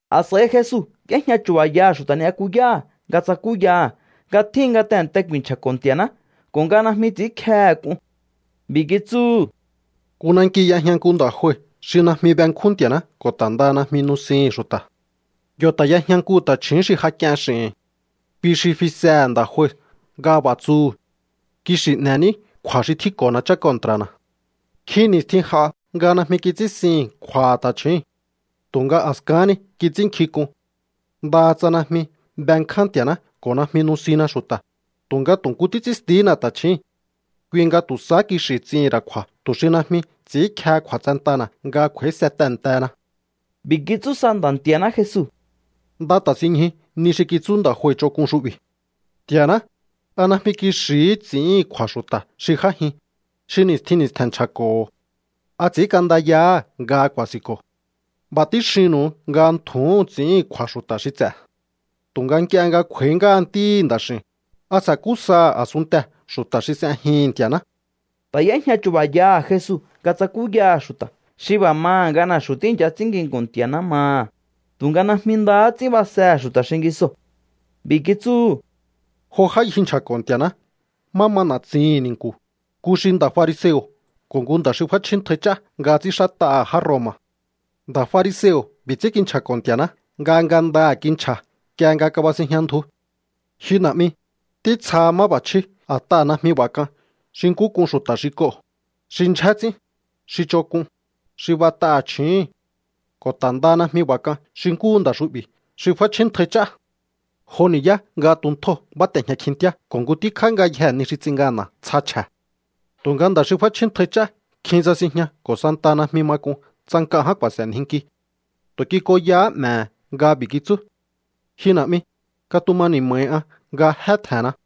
A̱s'a̱i Jesu y'éjña chu̱ba̱yaha̱ xu̱ta̱ ni'yakuyáha̱ nga tsakúyaha̱ nga tjíhin nga tehe̱nte ku̱i̱nchja̱ Nti̱a̱ná ko̱ nga najmi ts'i̱ínkjehe̱ k'un. B'i̱ kitsúhu̱: —Nku nanki y'ejña nku nda̱ jue xi najmi benkjún Nti̱a̱ná ko̱ ta̱ ndaha najmi nusihi̱n xu̱ta̱. Yo̱ ta̱ y'ejña nku ta̱chju̱ún xi ja k'ien x'i̱hi̱n. Kui xi fisehe̱ nda̱ jue nga b'a̱ tsuhu̱: “Kixi̱ n'e̱ní kju̱a̱ xi tjínko̱na chá kontra̱na̱.” Nkjin ni̱stjin j'a nga najmi kits'íhi̱n kju̱a̱ ta̱chjúu̱n. Tu̱nga a̱skahán ni kits'ínnkjink'un: “Ndaha tsa najmi benkján Nti̱a̱ná ko̱ najmi nusinna xu̱ta̱, tu̱nga tu̱ nku títs'ínstihína ta̱chjíi̱n. Kui nga tu̱ sahá kixi̱ ts'ihi̱n ra̱ kju̱a̱ tu̱ xi najmi ts'i̱ínkjehe kju̱a̱tsentana̱ nga kj'u̱a̱íse tehe̱ntena.” B'i̱ kitsú sa Nda̱ Nti̱a̱ná Jesu: —Nda ta̱sinñju ni xi kitsú nda̱ jue ch'onk'un xu'bi̱. Nti̱a̱ná, ¿a najmi kixi̱hí ts'i̱íhi̱n kju̱a̱ xu̱ta̱ xi j'ájin, xi ni̱stjin ni̱stje̱n nchja̱ko̱ho̱? ¿A ts'i̱ínk'andayahá nga ku̱a̱si̱nko̱? B'a̱ tíxinnu̱u nga ntju̱úhu̱n ts'i̱íhi̱n kju̱a̱ xu̱ta̱ xi ts'e̱. Tu̱nga nk'ie nga kj'u̱a̱í ngáha Ntíhi̱ Nda̱x'i̱u̱n, ¿a sa̱kú saha̱ a̱sunntee̱ xu̱ta̱ xi s'ejihi̱n Nti̱a̱ná? Ta̱ y'éjña chu̱ba̱yaha̱ Jesu nga tsakúyaha̱ xu̱ta̱ xi b'a̱ maha̱ nga na̱xu̱ tíi̱ncha ts'ín nginku̱n Nti̱a̱ná maha̱, tu̱nga najmi ndahá ts'ín basehe̱ xu̱ta̱ xingisoo̱. B'i̱ kitsúhu̱: —Jo já ngji nchja̱ko̱ Nti̱a̱ná má ma na̱tsihi̱n ni̱nku̱, nku xi nda̱ fariseo̱ ko̱ nku nda̱ xi f'áchjíntjai ch'á nga ts'ínxát'aha̱ já Roma̱. Nda̱ fariseo̱ b'i̱ ts'ín kinchja̱ko̱ Nti̱a̱ná nga ngandaha̱ kinchja̱ nk'ie nga kabasinjña ndju: “Ji Na̱'mi, títsjaha máb'a̱chjí a̱t'aha̱ najmi b'a̱ k'an xi nkú k'un xu̱ta̱ xi k'oo̱, xi ndyjé ts'ín, xi ch'onk'un, xi b'at'aha̱ chju̱úhu̱n. Ko̱ ta̱ ndaha najmi b'a̱ k'an xi nkúhu nda̱ xu'bi̱ xi f'áchjíntjai ch'á. Jo ni̱yá nga tuntjóo̱ báte̱jña kjintíá ko̱ nku tíkjá ngayjee̱ ni xi ts'in ngana̱ tsja chje̱.” ’Tu̱nga nda̱ xi f'áchjíntjai ch'á kjin tsasinjña ko̱ santaha najmi ma k'un tsa nk'a ján ku̱a̱se̱njinki. Tu̱ kik'onyahá 'me̱he̱ nga b'i̱ kitsú: “Ji Na̱'mi, katuma ni̱ma̱hi an nga jé tje̱nna.”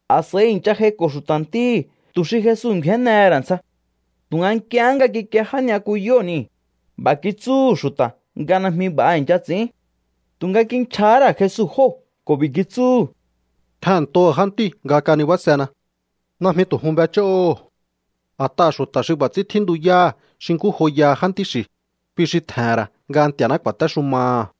A̱s'a̱i i̱ncha j'aiko̱ xu̱ta̱ ntíhi̱ tu̱ xi Jesu ngju̱énnehe̱ ra̱ ntsja. Tu̱nga nk'iehé nga kikie já ni'yakuyóo̱ nii̱, b'a̱ kitsúhu̱ xu̱ta̱ nga najmi b'a̱ i̱ncha ts'i̱ín. Tu̱nga kinchja̱há ra̱ Jesu jóo̱ ko̱ b'i̱ kitsúhu̱: —Tjehe̱nntoho̱ jántíu̱ nga kanibásena. Najmi tu̱ jun b'ech'óho̱o. A̱t'aha̱ xu̱ta̱ xi b'a̱ ts'ín tjíntuyáha̱ xi nkú joyaha jántí xi̱, kui xi tje̱he̱n ra̱ nga Nti̱a̱ná ku̱a̱téxumaha̱.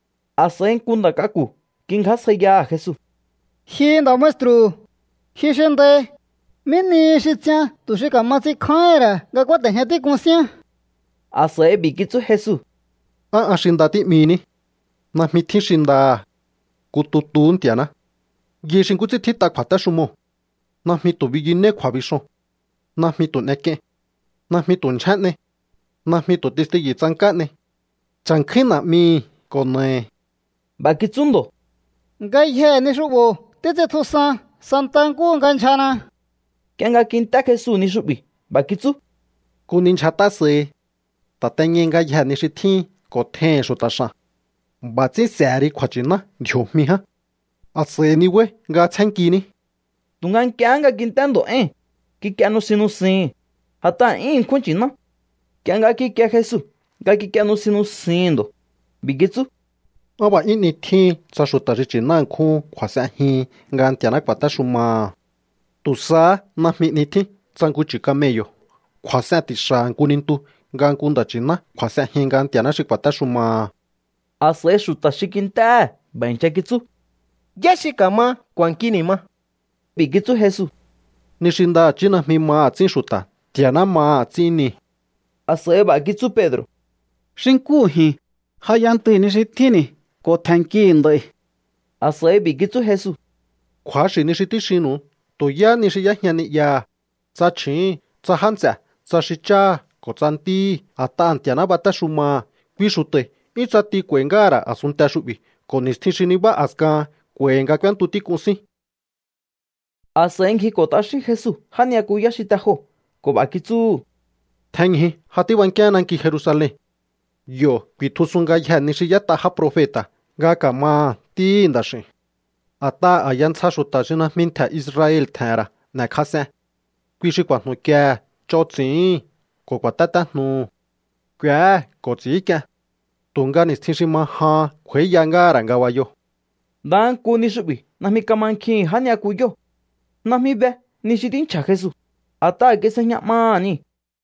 A̱s'a̱i nku nda̱ k'aku̱ kingjásjaiyaha̱ Jesu: —Ji nda̱ maestru̱, ji xi ndai, ¿mí nihi xi ts'ian tu̱ xi ka̱ma ts'inkjáíhi̱n ra̱ nga kúáte̱jña tík'un síán? A̱s'a̱i b'i̱ kitsú Jesu: —¿Á an xi nda tí'mihiní? Najmi tjín xi ndaha̱, nku tutuhú Nti̱a̱ná. Yai xi nkú ts'ín tjít'a kju̱a̱téxumoo̱: “Najmi tu̱ biyunéí kju̱a̱bixoo̱n. Najmi tu̱ n'ek'iein. Najmi tu̱ ndyjé n'ei. Najmi tu̱ testiyu̱ tsank'á n'ei. Cha̱nkjúín na̱'mihi̱ ko̱ na̱ahi̱.” B'a̱ kitsú ndo̱: —Ngayjee̱ ni xu'bo̱ títs'intjusan santa nkúhu nga ndyjana. Nk'ie nga kint'é Jesu ni xu'bi̱ b'a̱ kitsú: —Nku ni ndyjat'á sahi. Ta̱teñai ngayjee̱ ni xi tjíhin ko̱ tjeihi̱n xu̱ta̱ x'a̱n. B'a̱ ts'ín s'e̱he ri kju̱a̱nchi̱ná ndji̱o̱jmi ján. A̱s'a̱i nibáí nga tsjénnkiní. Tu̱nga nk'iehé nga kint'é ndo̱ éi̱n, kik'ie nusin nusihi̱n, a̱t'aha̱ 'yún ṉkjún nchi̱ná. Nk'ie nga kikie Jesu nga kik'ie nusin nusihi̱n ndo̱, b'i̱ kitsú: —¡Á b'a̱ 'yún 'ni tjíhin tsa xu̱ta̱ xi nchi̱ná ṉkjúhun kju̱a̱s'enjihin nga Nti̱a̱ná ku̱a̱téxumaha̱! Tu̱ sahá najmi 'ni tjín tsa nku chu̱ camello̱ kju̱a̱s'en ti̱xa̱ha̱ nku nintu nga nku nda̱ nchi̱ná kju̱a̱s'enjin nga Nti̱a̱ná xi ku̱a̱téxumaha̱. A̱s'a̱i xu̱ta̱ xi kint'éhe̱ b'a̱ i̱ncha kitsú: —¿Yá xi ka̱ma k'u̱a̱nki ni̱ ma? B'i̱ kitsú Jesu: —Ni xi ndaha̱chí najmi maha̱ ts'ín xu̱ta̱, Nti̱a̱ná maha̱ ts'ín nii̱. A̱s'a̱i b'a̱ kitsú Pedro̱: —Xi nkúhu ji̱n, ja y'entui̱ ni xi tjínni̱ ko̱ tje̱nnkihi̱ nd'a̱i̱. A̱s'a̱i b'i̱ kitsú Jesu: —Kju̱axi̱ ni xi tíxinnu̱u. Tu̱ yáhá ni xi y'éjña ni'yaha̱, tsa chju̱úhu̱n, tsa já nts'e̱, tsa xi cháha̱ ko̱ tsa ntíhi̱ a̱t'aha̱ Nti̱a̱ná batéxumaha̱, kui xu̱ta̱i̱ 'yún ts'ati k'u̱a̱i̱ ngáha̱ ra̱ a̱sunnte xu'bi̱ ko̱ ni̱stjin xi nibá a̱skahan k'u̱a̱i̱hi̱ nga k'úéntu tík'un sín. A̱s'a̱i ngjiko̱ t'axín Jesu já ni'yakuyá xi te joo̱ ko̱ b'a̱ kitsúhu̱: —Tjenñju. Ja tíbankíaán nanki Jerusalen. Yo̱ ku̱i̱tjusun ngayjee̱ ni xi y'ét'a já profeta̱ nga ka̱maha̱ Ntíhi̱ Nda̱x'i̱u̱n. A̱t'aha̱ a̱ya ntsja xu̱ta̱ xi najmi ntje̱ Israel tje̱he̱n ra̱ n'e̱kjas'en. Kui xi ku̱a̱jnu̱kiehe̱, ch'on ts'i̱íhi̱n, ko̱ ku̱a̱tétéjnuhu̱. K'u̱éhe̱ ko̱ ts'i̱ínk'ien. Tu̱nga ni̱stjin xi ma jahan kj'u̱a̱íya ngáha̱ ra̱ ngabayoo̱. Ndaha nku ni xu'bi̱ najmi kamankjihi̱n já ni'yakuyóo̱. Najmi be ni xi tínchja̱ Jesu, a̱t'aha̱ kis'ejña 'maha̱ niu̱.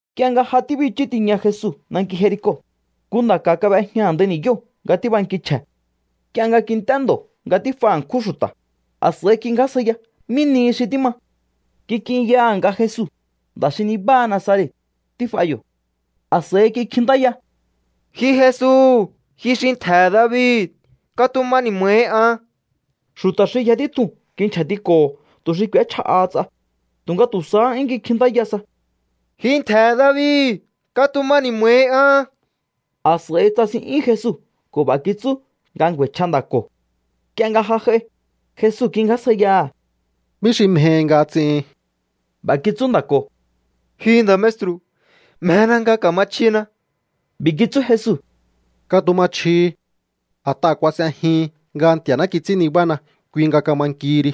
Nk'ie nga ja tíbichú tiña Jesu nanki Jerico, nku nda̱ ka̱ kab'ejña a̱ndai ni̱yóo̱ nga tíbanki chje̱. Nk'ie nga kint'é ndo̱ nga tíf'a ṉkjún xu̱ta̱, a̱s'a̱i kingjásjaiya mí nihi xi tíma. Kik'inyaha̱ nga Jesu, nda̱ xi nibáha Nazaret, tíf'a yo̱. A̱s'a̱i kikjintáya: —¡Ji Jesu, ji xi ntje̱he̱ David, katuma ni̱ma̱hi an! Xu̱ta̱ xi yja títjuu̱n kinchja̱tiko̱ho̱ tu̱ xi k'u̱échja'aha ts'a, tu̱nga tu̱ sahá 'yún kikjintáya sa: —¡Ji ntje̱he̱ David, katuma ni̱ma̱hi an! A̱s'a̱i tsasin'yún Jesu ko̱ b'a̱ kitsú nga ngju̱a̱i̱chj'a nda̱ ko̱. Nk'ie nga ja j'ai, Jesu kingjásjaiyaha̱: —¿Mí xi mjehi nga ts'ihin? B'a̱ kitsú nda̱ ko̱: —Ji nda̱ maestru̱, mjena nga ka̱ma chjina. B'i̱ kitsú Jesu: —Katuma chjihi. A̱t'aha̱ kuas'ejihin nga Nti̱a̱ná kits'ín nibána, kui nga kama nkihi ri.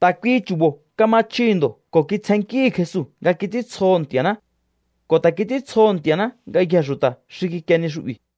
Ta̱ kuihi chu̱bo̱ kama chjihi̱ ndo̱ ko̱ kitsjennkíhi̱ Jesu nga kits'íntsjoho̱ Nti̱a̱ná. Ko̱ ta̱ kits'íntsjoho̱ Nti̱a̱ná ngayjee̱ xu̱ta̱ xi kikie ni xu'bi̱.